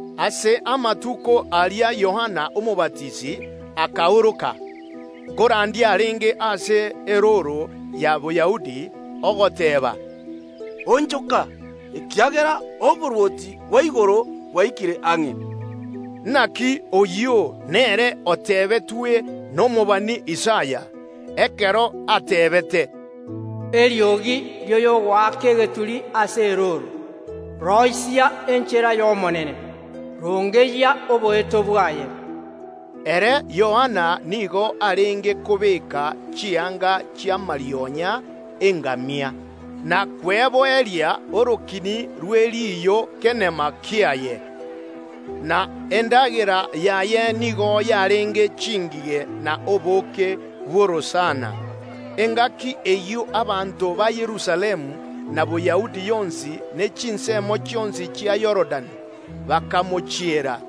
Ase amatuko aria Yohana Omobatisi akaoroka ase erooro ya Boyahudi agachaaka korandia, ogoteeba, “Onchoka, ekiagera oborwoti bwa igoro bwaikire ang’e!” Oyo Yohana nere oteebetwe n’omobani Isaya, ekero ateebete, “Eriogi ri’oyogoaka egeturi ase erooro: Roisia enchera y’Omonene, rongeyia oboeto bwaye.” Ere Yohana nigo arenge kobeeka chianga chiaroiseirie amarionya y’engamia na kweboeria orokini rwe riiyo kenama kiaye, na endagera yaye nigo yarenge chingige na obooke bw’orosana. Engaki eyio abanto ba Yerusalemu, na Boyahudi yonsi, ne chinsemo chionsi chia Yorodani bakamochiera.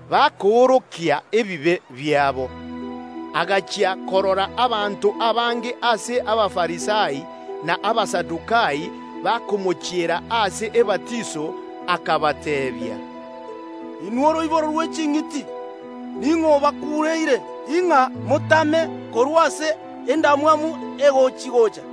Ekero Yohana arora abanto abange ase Abafarisai na Abasadukai bakomochiera erio ababatise, akabateebia, “Inwe oroiboro rwe chinchoka, ning’o obakuureire ng’a motame korwa ase endamwamu egochia‐gocha?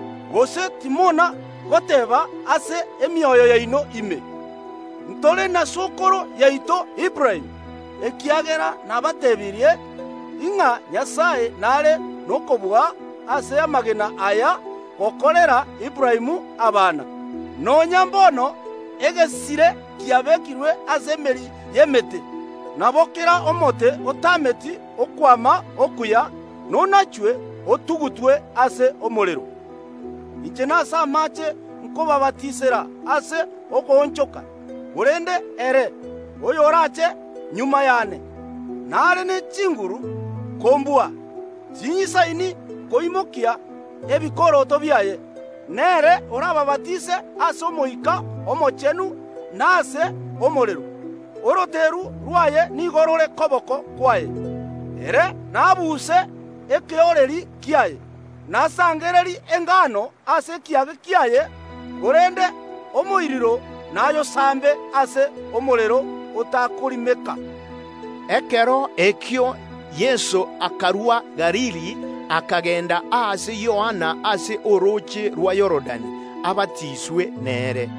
gose timona goteeba ase emioyo yaino ime: Ntore na sokoro yaito Aburaamu, ekiagera nabateebirie, ng’a Nyasae n’are nokobua ase amagena aya gokorera Aburaamu abana. Nonya mbono egesire kiabekirwe ase emeri y’emete; nabo kera omote otaameti okwama okuya nonachwe, otugutwe ase omorero. “Inche n’amaache nkobabatisera ase okoonchoka, korende ere, oyoraache magega y’ane, nare ne chinguru kombua. Ting’isaini koimokia ebikoroto biaye. N’ere orababatise ase Omoika Omochenu na ase omorero. Oroteru rw’aye nigo rore koboko kwaye, ere naabuse ekeooreri kia’ye, nasangererie engano ase ekiage kiaye, korende omoiruro nayosambe ase omorero otakorimeka.” Ekero ekio Yeso akarua Galili, akagenda ase Yohana ase orooche rwa Yorodani abatiswe nere.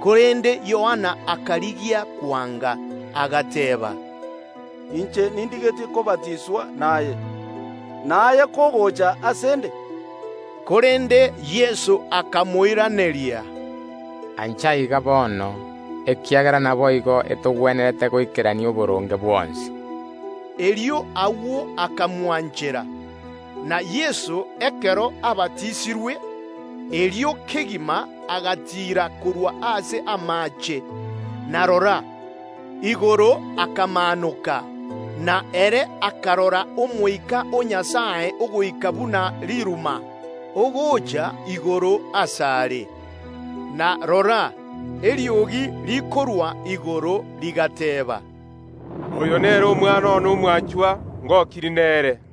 Korende Yohana akarigia kwanga, agateeba, “Inche ndigetie kobatiswa naye, na aye kogocha ase ’nde?” Korende Yeso akamoiraneria, “Ancha ebe iga bono, ekiagera naboigo etogwenerete goikerania oboronge bwonsi.” Erio agwo Yohana akamwanchera. Na Yeso, ekero abatisirwe, agendererete gotiira korwa ase amaache ime; igoro ekamaanoka, na ere akarora Omoika o Nyasae ogoika buna riruma, ogocha igoro ase are. Na rora, eriogi rikarwa igoro rigateeba, “Oyo nere Omwana one omwanchwa, oyio ngokirie nere.”